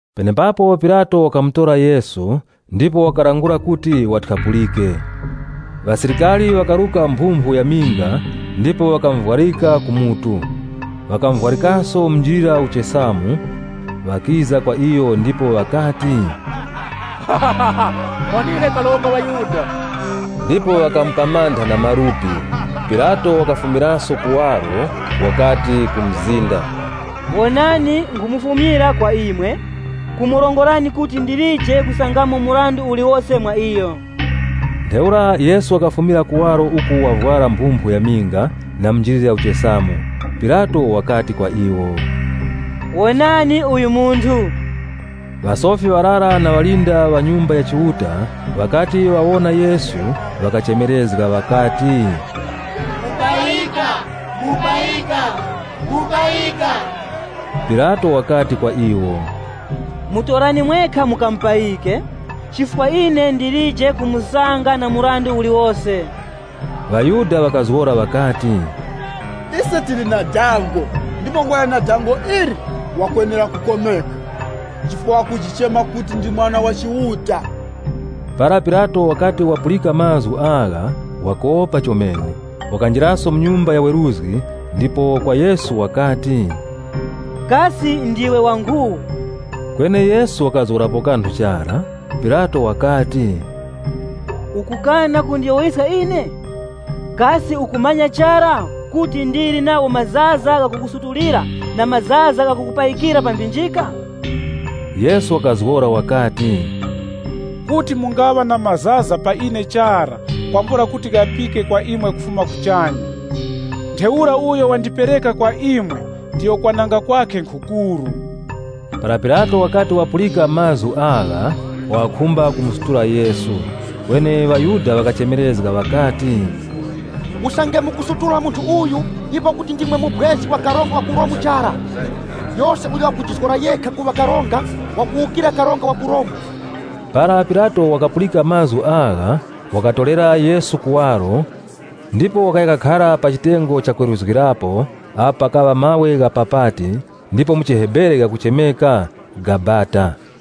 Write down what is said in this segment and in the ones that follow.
Penepapo Pilato wakamutora Yesu ndipo wakalangula kuti wathyapulike. Ŵasilikari ŵakaruka mphumphu ya minga ndipo ŵakamuvwarika ku mutu. Ŵakamuvwarikaso munjilira uchesamu. Ŵakiza kwa iyo ndipo ŵakati, “Muwonire Karonga wa ŵaYuda!” Ndipo ŵakamupamantha na malupi. Pilato wakafumiraso kuwaro, wakati ku mzinda, “Wonani nkhumufumyira kwa imwe, kumurongorani kuti ndilije kusangamo mrandu uliwose mwa iyo.” Ntheura Yesu wakafumira kuwaro uku wavwara mphumphu ya minga na munjilira uchesamu. Pilato wakati kwa iwo, “Wonani uyu munthu!” Ŵasofi ŵarara na ŵalinda ŵa ku Nyumba ya Chiuta ŵakati ŵawona Yesu, ŵakachemerezga ŵakati, “Mupayika! Mupayika!” Pilato wakati kwa iwo, “Mutorani mwekha mukamupayike, chifukwa ine ndilije kumusanga na mrandu uliwose.” ŴaYuda ŵakazgora ŵakati, “Ise tili na dango, ndipo kwakuyana na dango ili, wakwenera kukomeka. Chifukwa wakujichema kuti, ‘Ndi Mwana wa Chiuta.’” Para Pilato wakati wapulika mazgu agha, wakopa chomene. Wakanjiraso mu nyumba ya weruzgi ndipo kwa Yesu wakati, “Kasi ndiwe wa nkhu?” Kweni Yesu wakazgorapo kanthu chara. Pilato wakati, “Ukukana kundiyowoyeska ine? Kasi ukumanya chara kuti ndili nagho mazaza gha kukusutulira na mazaza gha kukupayikira pa mphinjika?” Yesu wakazgora wakati, “Kuti mungaŵa na mazaza pa ine chara kwambula kuti ghapike kwa imwe kufuma kuchanya. Ntheura uyo wandipereka kwa imwe, ndiyo kwananga kwakhe nkhukuru.” Para Pilato wakati wapulika mazgu agha, wakapenja kumusutula Yesu. Kweni ŵaYuda ŵakachemerezga ŵakati, “Usange mukumusutula munthu uyu, ipo kuti ndimwe mubwezi wa karonga wa ku Romu chara. Yose uyo wakujizgora yekha kuŵa karonga, wakuwukira karonga wa ku Romu.” Para Pilato wakapulika mazgu agha, wakatorera Yesu kuwaro, ndipo wakaya kakhara pa chitengo cha kweruzgirapo pa “Malo ghakwalikika na mawe” ghakuchemeka “Gabata” mu chiHebere.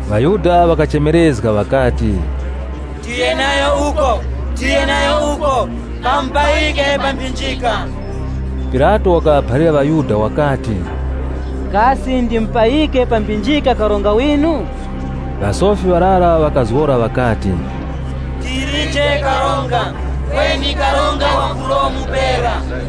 ŴaYuda ŵakachemerezga ŵakati, “Tiye nayo uko! Tiye nayo uko! Kamupayike pa mphinjika!” Pilato wakaŵaphalira ŵaYuda wakati, “Kasi ndipayike pa mphinjika karonga winu?” Ŵasofi ŵarara ŵakazgora ŵakati, “Tilije karonga, kweni karonga wa ku Romu pera.”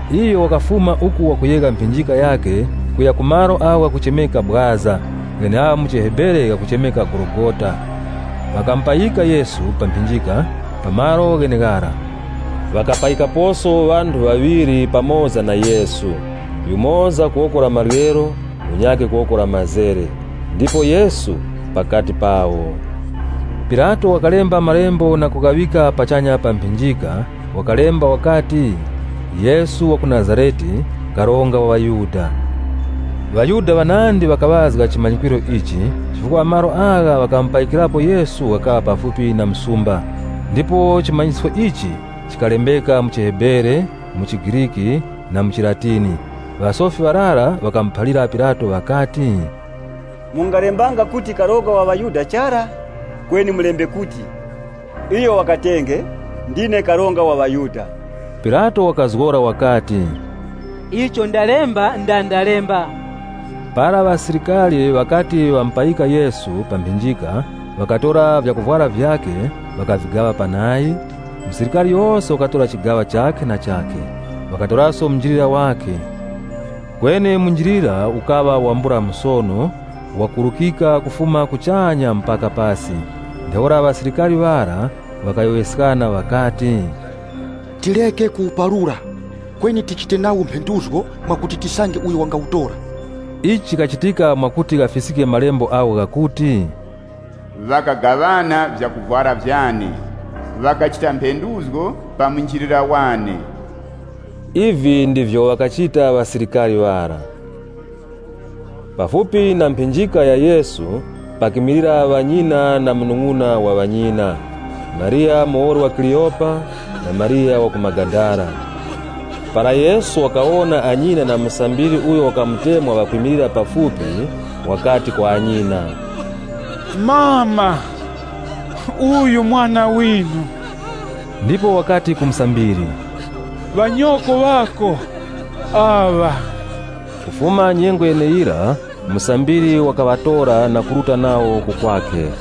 Iyo wakafuma uku wakuyegha mphinjika yakhe kuya ku malo agho ghakuchemeka “Bwaza” gheneagho mu chiHebere ghakuchemeka “Gologota.” Ŵakamupayika Yesu pa mphinjika pa malo gheneghara. Ŵakapayikaposo ŵanthu ŵaŵiri pamoza na Yesu, yumoza ku woko la maryero, munyakhe ku woko la mazere ndipo Yesu pakati pawo. Pilato wakalemba malembo na kughaŵika pachanya pa mphinjika, wakalemba wakati, “Yesu wa ku Nazarete, Karonga wa ŵaYuda.” ŴaYuda ŵanandi ŵakaŵazga chimanyisko ichi, chifukwa malo agho ŵakamupayikirapo Yesu ghakaŵa pafupi na msumba, ndipo chimanyisko ichi chikalembeka mu chiHebere, mu chiGriki na mu chiLatini. Ŵasofi ŵarara ŵakamuphalira Pilato ŵakati, “Mungalembanga kuti, ‘Karonga wa ŵaYuda’ chara, kweni mulembe kuti, ‘Iyo wakatenge, ndine Karonga wa ŵaYuda.’” Pilato wakazgora wakati, “Icho ndalemba, nda ndalemba.” Para ŵasilikari ŵakati ŵamupayika Yesu pa mphinjika, ŵakatora vyakuvwara vyakhe, ŵakavigaŵa panayi. Musilikari yose wakatora chigaŵa chakhe na chakhe. Ŵakatoraso munjilira wakhe. Kweni munjilira ukaŵa wambula musono, wakurukika kufuma kuchanya mpaka pasi. Ntheura ŵasilikari ŵara ŵakayowoyeskana ŵakati, “Tireke kuwuparura, kweni tichite nawo mphenduzgo mwakuti tisange uyo wangawutora.” Ichi chikachitika mwakuti ghafiskike Malembo agho ghakuti, “Ŵakagaŵana vyakuvwara vyane, ndipo ŵakachita mphenduzgo pa munjilira wane.” Ivi ndivyo ŵakachita ŵasilikari ŵara. Pafupi na mphinjika ya Yesu, pakimilira ŵanyina na munung'una wa ŵanyina, Mariya muwoli wa Kleopa, na Mariya wa ku Magadala. Para Yesu wakawona anyina na musambiri uyo wakamutemwa, ŵakwimilira pafupi, wakati kwa anyina, “Amama, uyu mwana winu.” Ndipo wakati ku musambiri, “Ŵanyoko ŵako aŵa.” Kufuma nyengo yeneyira musambiri wakaŵatora na kuruta nawo ku kwakhe.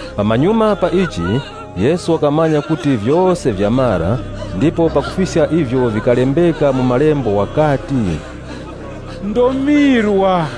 Pamanyuma pa ichi, Yesu wakamanya kuti vyose vyamara ndipo pakufiska ivyo vikalembeka mu Malembo wakati, “Ndomirwa.”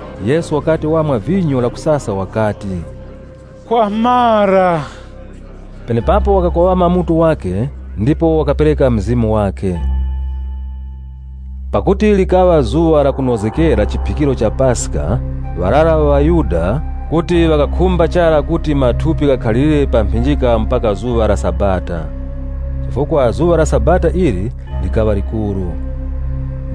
Yesu wakati wamwa vinyo lakusasa wakati, “Kwamara.” Penepapo wakakoŵama mutu wakhe ndipo wakapereka mzimu wakhe. Pakuti likaŵa zuŵa la kunozgekera chiphikiro cha Paska, ŵarara ŵa ŵaYuda kuti ŵakakhumba chara kuti mathupi ghakhalirire pa mphinjika mpaka zuŵa la Sabata Chifukwa zuŵa la Sabata ili likaŵa likuru.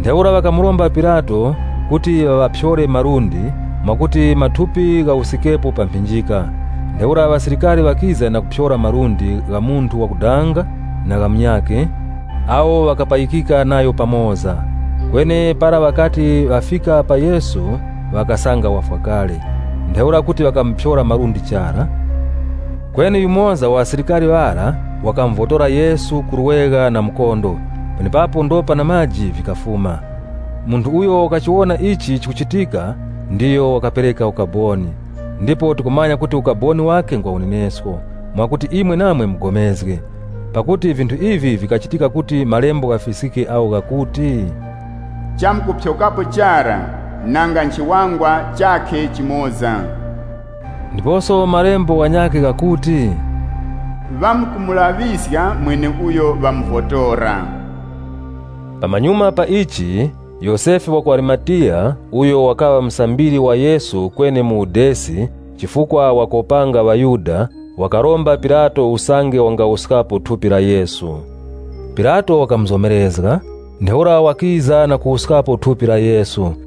Ntheura ŵakamuromba Pilato kuti ŵaŵaphyore malundi, mwakuti mathupi ghawuskikepo pa mphinjika. Ntheura ŵasilikari ŵakiza na kuphyora malundi gha munthu wakudanga na gha munyakhe, awo ŵakapayikika nayo pamoza. Kweni para ŵakati ŵafika pa Yesu, ŵakasanga wafwa kale. Ntheura kuti ŵakamuphyora malundi chara. Kweni yumoza wa ŵasilikari ŵara ŵakamuvotora Yesu ku lwegha na mukondo, penepapo ndopa na maji vikafuma. (Munthu uyo wakachiwona ichi chikuchitika, ndiyo wakapereka ukaboni. Ndipo tikumanya kuti ukaboni wakhe ngwa unenesko, mwakuti imwe namwe mupulikane.) Pakuti vinthu ivi vikachitika kuti Malembo ghafiskike agho ghakuti, “Chamkuphyokapo nanga nchiwangwa chakhe chimoza chara.” Ndiposo Malembo ghanyakhe ghakuti, “Ŵamkumulaŵiska mweneuyo ŵamuvotora.” Pamanyuma pa ichi, Yosefe wa ku Arimatiya (uyo wakaŵa musambiri wa Yesu kweni mu udesi, chifukwa wakopanga ŵaYuda,) wakaromba Pilato usange wangawuskapo thupi la Yesu. Pilato wakamuzomerezga. Ntheura wakiza na kuwuskapo thupi la Yesu.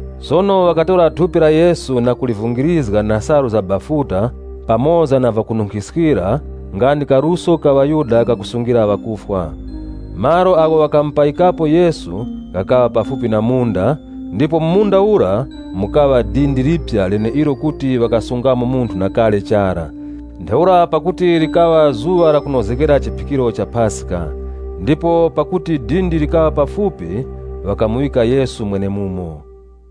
Sono ŵakatora thupi la Yesu, na kulivungirizga na salu za bafuta pamoza na vyakununkhiskira, nga ndi kaluso ka ŵaYuda kakusungira ŵakufwa. Malo agho ŵakamupayikapo Yesu ghakaŵa pafupi na munda, ndipo mu munda ura mukaŵa dindi liphya leneilo kuti ŵakasungamo munthu na kale chara. Ntheura pakuti likaŵa zuŵa la kunozgekera chiphikiro cha Paska, ndipo pakuti dindi likaŵa pafupi, ŵakamuŵika Yesu mwenemumo.